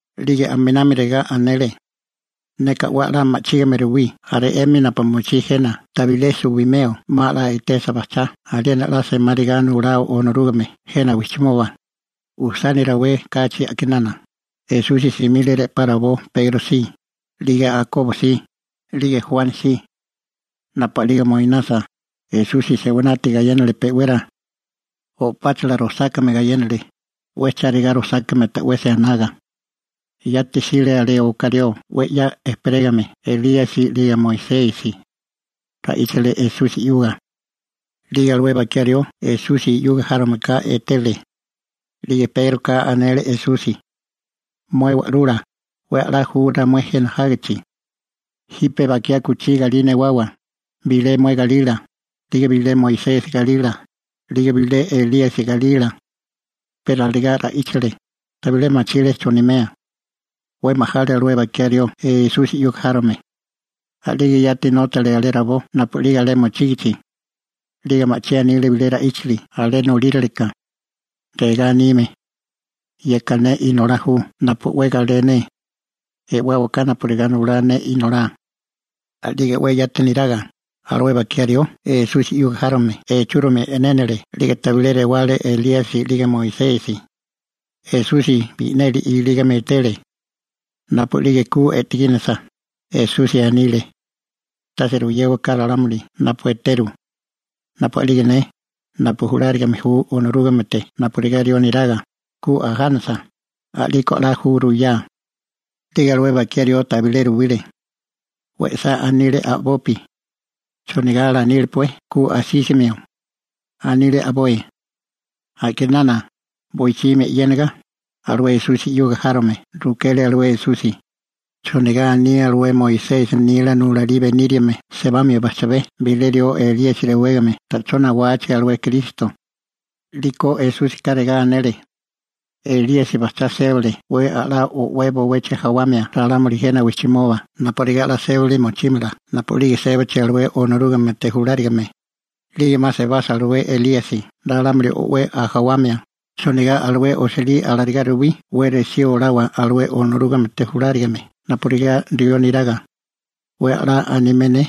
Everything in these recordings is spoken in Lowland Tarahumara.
'Lige aminami regá anele: ―Neka 'we a'lá ma'chígame ruwí jaré 'emi napu mochí jena tabilé suwimeo 'ma 'la etesa bajchá aliena 'la semáriga nulao Onorúgame jena wijchimoba. Ujsani rawé kachi a'kinana, Esusi simile re'pá rabó Pegro si, 'lige Jakobo si, 'lige Juani si. Napu a'lige moinasa, Esusi se'winati gayénale pe'wera. O'páchala rosákame gayénale, 'we chárigá rosákame ta'wesi anaga. Yati jsile alé oká rió 'we 'ya ejperégame Elíasi 'lige Moisesi. Ra'íchale Esusi 'yuga. 'Lige alué bakiá rió Esusi 'yuga járomeka etele. 'Lige Pégroka anele Esusi: ―Mué Wa'lula, 'we a'lá ju ramué jena jágichi. Jipe bakiá kuchí galí newawa, bilé mué galila, 'lige bilé Moisesi galila, 'lige bilé Elíasi galila. Pe alarigá ra'íchale, tabilé machile chonimea. 'We majale alué bakiá rió Esusi 'yuga járome. A'lige yati nótale alé rabó napu'lige alé mochígichi. 'Lige ma'chí anile bilé ra'íchili alé nolíraleka. Regá anime: ―Yeka ne Inolá ju napu 'we galé ne. E'wáwaká napurigá nulá ne Inolá. A'lige 'we yati neraga, alué bakiá rió Esusi 'yuga járome echúromi e'nénale 'lige tabilé rewale Elíasi 'lige Moisesi. Esusi bi'neli ilígame etele. Napu'lige ku e'tegínasa, Esusi anile: ―Tase ruyéwaká ralámuli napu eteru. Napu a'lige ne, napu julárigame ju Onorúgamete napurigá rió neraga, ku ajánasa, a'liko 'la ju ruyá. 'Lige alué bakiá rió tabilé ruwile. We'sá anile a'bopi: «¿Chonigá alanílepué ku asísimio?» anile a'boi. A'kinana, boichimi 'yéniga, alué Esusi 'yuga járome rukele alué Esusi: ―¿Chonigá aní alué Moisesi nila nulalí beníriame sebamio bajchabé bilé rió Elíasi rewégame ta'chó nawachi alué Kristo? 'Lige Esúsika regá anele: ―Elíasi bajchá sébale 'we a'lá o'wé bowechi jawamia ralámuli jena wijchimoba napurigá 'la sébili mochímala napu'lige sébachi alué Onorúgamete julárigame. 'Lige 'ma sebasa alué Elíasi ralámuli o'wé ajawamia, ¿chonigá alué osilí alarigá ruwí 'we resí olawa alué Onorúgamete julárigame napurigá rió neraga? 'We a'lá animé ne.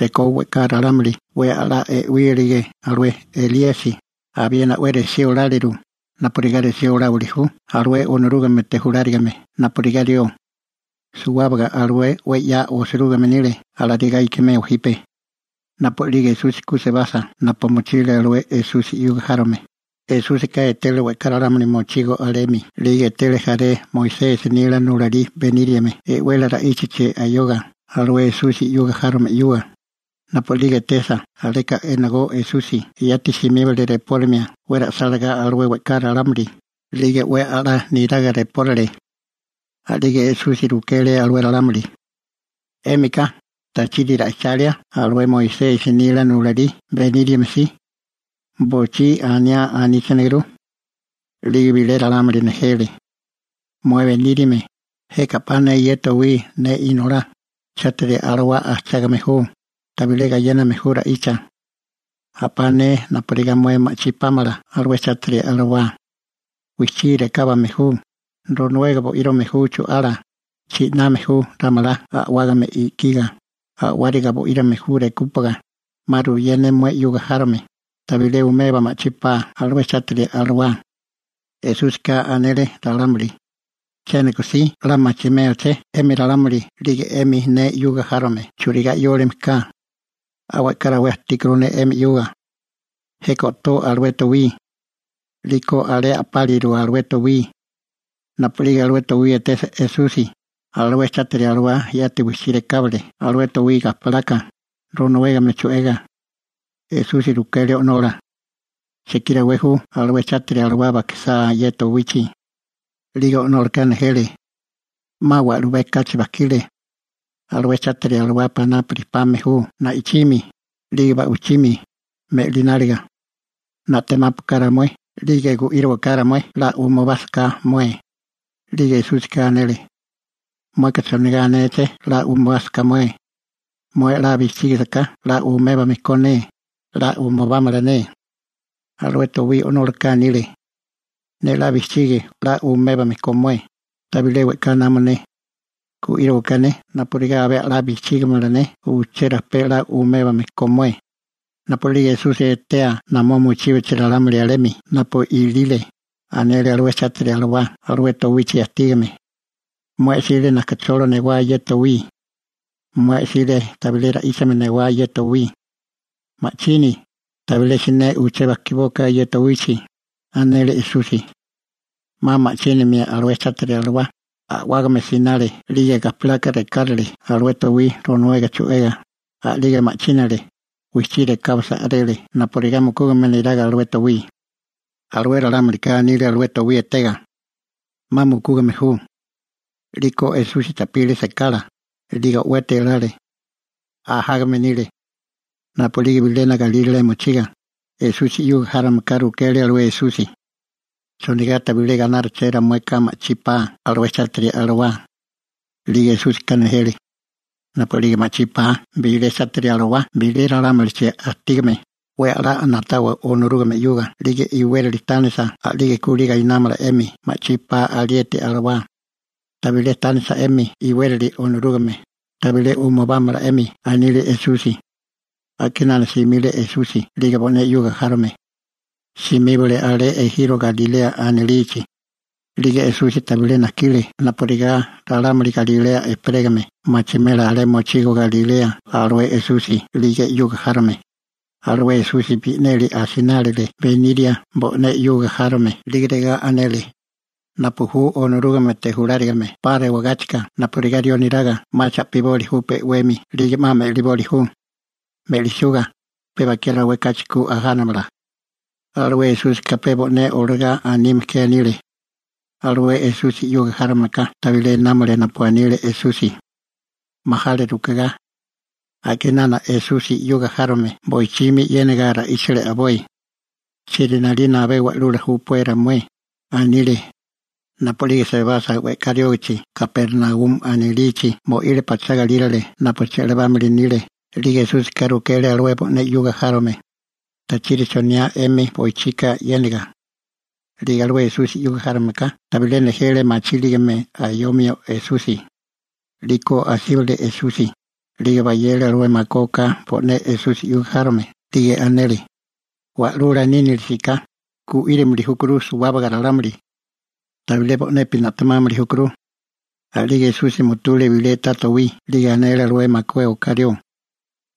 Rekó we'ká ralámuli 'we a'lá e'wílige alué Elíasi, abiena 'we resí oláliru, napurigá resí oláwili ju alué Onorúgamete julárigame napurigá rió. Suwábaga alué 'we 'ya osirúgime nile alarigá ikimeo jipe. Napu a'lige Esusi ku sebasa napu mochile alué Esusi 'yuga járome, Esúsika etele we'ká ralámuli mochigo alemi 'lige etele jaré Moisesi nila nulalí beníriame e'wele ra'íchachi ayoga alué Esusi 'yuga járome 'yuga. Napu a'lige etesa aleka enagó Esusi yati simíbale repórimia 'we ra'sálagá suwábaga alué we'ká ralámuli, 'lige 'we a'lá niraga repórile. A'lige Esusi rukele alué ralámuli: ―'Émika ¿tachiri ra'ichalia alué Moisesi nila nulalí beníriame si? Bochí aniá aníchaneguru. 'Lige bilé ralámuli nejele: ―Mué beníriame, jeka a'pá ne ye towí, ne inolá, chátiri alawá ajchágame ju, tabilé gayéname ju ra'icha. A'pá ne napurigá mué ma'chí pámala alué chátiri alawá. Wijchí rekábame ju, ronuega bo'írame ju chu'ala, chi'name ju ramalá a'wágame i'kiga, a'wáraga bo'írame ju rekúpaga, 'ma ruyé ne mué 'yuga járome, tabilé umeba ma'chí 'pa alué chátiri alawá. Esúsika anele ralámuli: ―¿Chéniko si 'la machimélaché 'emi ralámuli 'lige 'emi ne 'yuga járome churigá 'yólime ka? 'Ma we'ká rawé ajtíkuru ne 'emi 'yuga. Jeka o'tó alué towí. 'Liko alé o'tóliru alué towí. Napu'lige alué towí etesa Esusi, alué chátiri alawá yati wijchí rekábale alué towí gajpalaka, ronuégame chu'ega. Esusi rukele o'nola: ―¿Chekí rawé ju alué chátiri alawala bajkisá ye towichi? 'Lige o'nólaka nejele: ―'Ma wa'lubé kachi bajkile. Alué chátiri alawá panápurimi pame ju na'ichimi, 'lige ba'wichimi, me'lináliga. Na'temápuaká ramué. Gu'írowaká ramué 'la umubásaká mué. 'Lige Esúsika anele: ―¿Mueka chonigá anéché «'la umubásiká mué»? Mué 'la bijchígasaká 'la umébame ko ne, 'la umubámala ne. Alué towí o'nólaka anile: ―Ne 'la bijchigi 'la umébame ko mué. Tabilé we'ká namo ne. Gu'írowaká ne napurigá abé 'la bijchígimala ne uché rajpé 'la umébame ko mué. Napu'lige Esusi etea namó mochíbachi ralámuli alemi napu ilile, anele alué chátiri alawá alué towichi ajtígame: ―Mué 'sile najkacholo newá ye towí. Mué 'sile tabilé ra'íchame newá ye towí. ¡Ma'chini, tabilé siné uché bajkibóaká ye towichi! ―anele Esusi. 'Ma ma'chínamia alué chátiri alawá, a'wágame sinale 'lige gajpalaka rekárale alué towí ronuega chu'ega, 'lige ma'chínale, wijchí rekábasa a'rele napurigá mukúgame neraga alué towí. 'Lige ralámulika anile alué towí etega: ―¡'Ma mukúgame ju! A'liko Esusi cha'pile sekala, 'lige o'weti elale. Ajágame nile. Napu'lige bilena galírale mochiga, Esusi 'yuga járomeka rukele alué Esusi: ―¿Chonigá tabilé gainárupeché ramueka ma'chí 'pa alué chátiri alawá? 'Lige Esúsika nejele: ―Napu'lige ma'chí 'pa bilé chátiri alawá bilé ralámulichi ajtígame, 'we a'lá na'tawa Onorúgame 'yuga 'lige iwérali tánisa a'lige kulí gainámala 'emi ma'chí pa alieti alawá. Tabilé tánisa 'emi iwérali Onorúgame, tabilé umubámala 'emi ―anile Esusi. A'kinana simile Esusi 'lige bo'né 'yuga járome. Simíbale alé ejiro Galilea anilichi. 'Lige Esusi tabilé najkile napurigá ralámuli Galilea ejperégame machimela alé mochigo alé Galilea alué Esusi 'lige 'yuga járome. Alué Esusi bi'neli asinálile beniria bo'né 'yuga járome, 'lige regá anele: ―Napu ju Onorúgamete julárigame 'pa rewagáchika napurigá rió neraga 'ma cha'piboli ju pe 'wemi 'lige 'ma me'liboli ju. Me'lisuga, pe bakiá rawé kachi ku ajánamala. (Alué Esúsika pe bo'né olagá anime ke anile.) Alué Esusi 'yuga járomeka tabilé námale napu anile Esusi. Majale rukegá. A'kinana Esusi 'yuga járome boichimi 'yéniga ra'íchale a'boi: ―¿Chieri 'nalina abé Wa'lula júpué ramué? ―anile. Napu'lige sebasa we'ká riógachi Kapernaumi anilichi mo'ile pachá galírale napu che'labámili nile 'lige Esúsika rukele alué bo'né 'yuga járome: ―¿Tachiri choniae 'emi boichika 'yénaga? 'Lige alué Esusi 'yuga járome ka tabilé nejele machíligame ayomio Esusi. 'Liko asíbale Esusi, 'lige bayele alué makué oká bo'né Esusi 'yuga járome 'lige anele: ―Wa'lula nínilisiká, gu'írimili júkuru suwábaga ralámuli. Tabilé bo'nepi na'temámili júkuru. A'lige Esusi mutule bilé ta towí 'lige anele alué makué oká rió: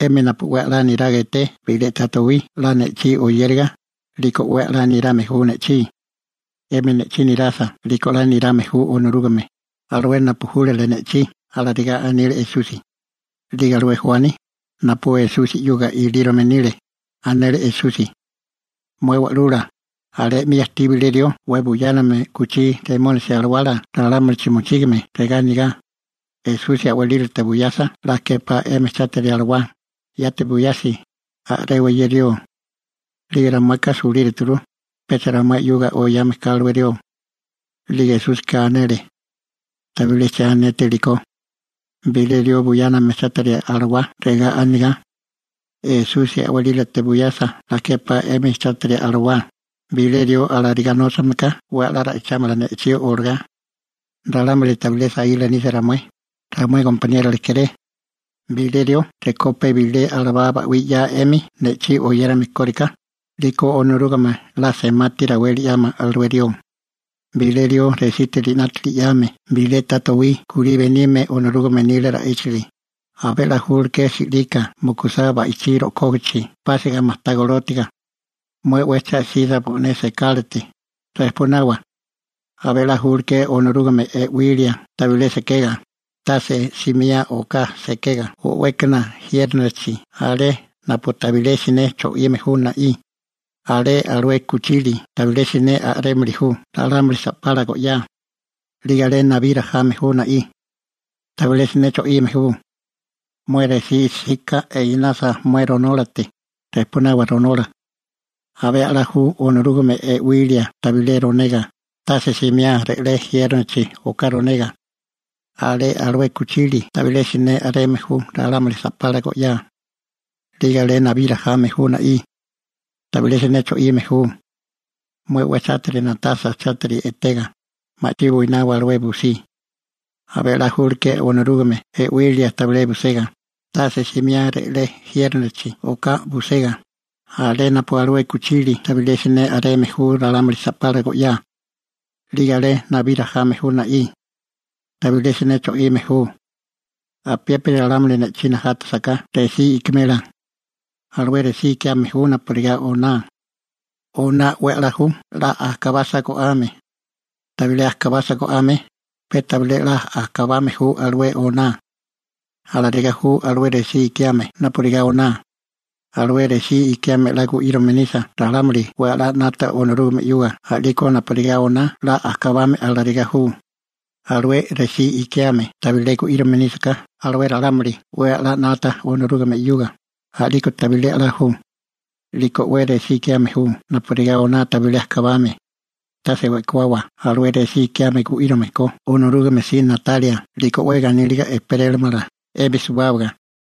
―'Emi napu 'we a'lá niraga eté bilé ta towí 'la ne'chí oyériga, 'liko 'we a'lá nirame ju ne'chí. 'Emi ne'chí nirasa 'liko 'la nirame ju Onorúgame, alué napu júlale ne'chí ―alarigá anile Esusi. 'Lige alué Juani, napu Esusi 'yuga ilírome nile, anele Esusi: ―Mué Wa'lula, alé 'mi ajtí bilé rió 'we buyáname u'kuchí remónisi alawala ralámulichi mochígame regá anigá: «Esusi a'walílate buyasa 'la képá 'emi chátiri alawá, yati buyasi, a'rewa ye rió.» 'Lige ramueka sulíruturu, pecha ramué 'yuga oyame kame alué rió. 'Liko Esúsika anele: ―Tabilé che anétéliko. Bilé rió buyáname chátiri alawá regá anigá: «Esusi a'walílate buyasa 'la képá 'emi chátiri alawá», bilé rió alarigá nóchame ka 'we a'lá ra'ichámala ne'chí olagá. Ralámuli tabilé saíla nisa ramué, ramué gompaniérola kéré. Bilé rió rekó pe bilé alabá ba'wí 'yae 'emi ne'chí oyérame kóriká, 'liko Onorúgame 'la semati raweli 'yámala alué rió. › Bilé rió resiti 'nátili 'yame bilé ta towí kulí benime Onorúgame nila ra'íchili, abé 'la nímala si'lika mukusá ba'ichí rojkógachi pásiga majtá golótiga. Mué 'we cha 'sisa mué bo'né sekálate, 'ma rejpunawa alué seká. Abé a'lá nímala Onorúgame e'wilia tabilé sekega, tase simiá oká sekega o'wékana jiérnochi alé napu tabilé siné cho'ime ju na'í. Alé alué kuchili tabilé siné a'rémili ju ralámuli sa'pala go'yá. 'Lige alé nabí rajame ju na'í. Tabilé siné cho'ime ju. Mué resí 'sika enasa mué ronólate, rejpunawa ronola. Abé a'lá ju Onorúgame e'wilia tabilé ronega, tase simiá re'lé jiérnochi oká ronega. Alé alué kuchili tabilé siné a'reme ju ralámuli sa'pala go'yá. 'Lige alé nabí rajame ju na'í. Tabilé siné cho'ime ju. Mué 'we chátiri na'tasa chátiri etega, ma'chí buinawa alué busí. Abé a'lá nímala Onorúgame e'wilia tabilé busega, tase simiá re'lé jiérnochi oká busega, alé napu alué kuchili tabilé siné a'reme ju ralámuli sa'pala go'yá. 'Lige alé nabí rajame ju na'í. Tabilé siné cho'ime ju. › Apiépiri ralámuli ne'chí najátasaká resí ikimela. Alué resí ikiame ju napurigá oná. Oná 'we a'lá ju 'la ajkabasa go'ame. Tabilé ajkabasa go'ame, pe tabilé 'la ajkabame ju alué oná. Alarigá ju alué resí ikiame napurigá oná. Alué resí ikiame 'la gu'írame nisa ralámuli 'we a'lá 'nata Onorúgame 'yuga a'liko napurigá oná 'la ajkabame alarigá ju. Alué resí ikiame tabilé gu'írome nísaká alué ralámuli 'we a'lá 'nata Onorúgame 'yuga, a'liko tabilé 'la ju. 'Liko alué resí ikiame ju napurigá oná tabilé ajkabame. Tase we'kuawa alué resí ikiame gu'írome ko Onorúgame si na'talia 'liko 'we ganíliga ejperélamala 'emi suwábaga.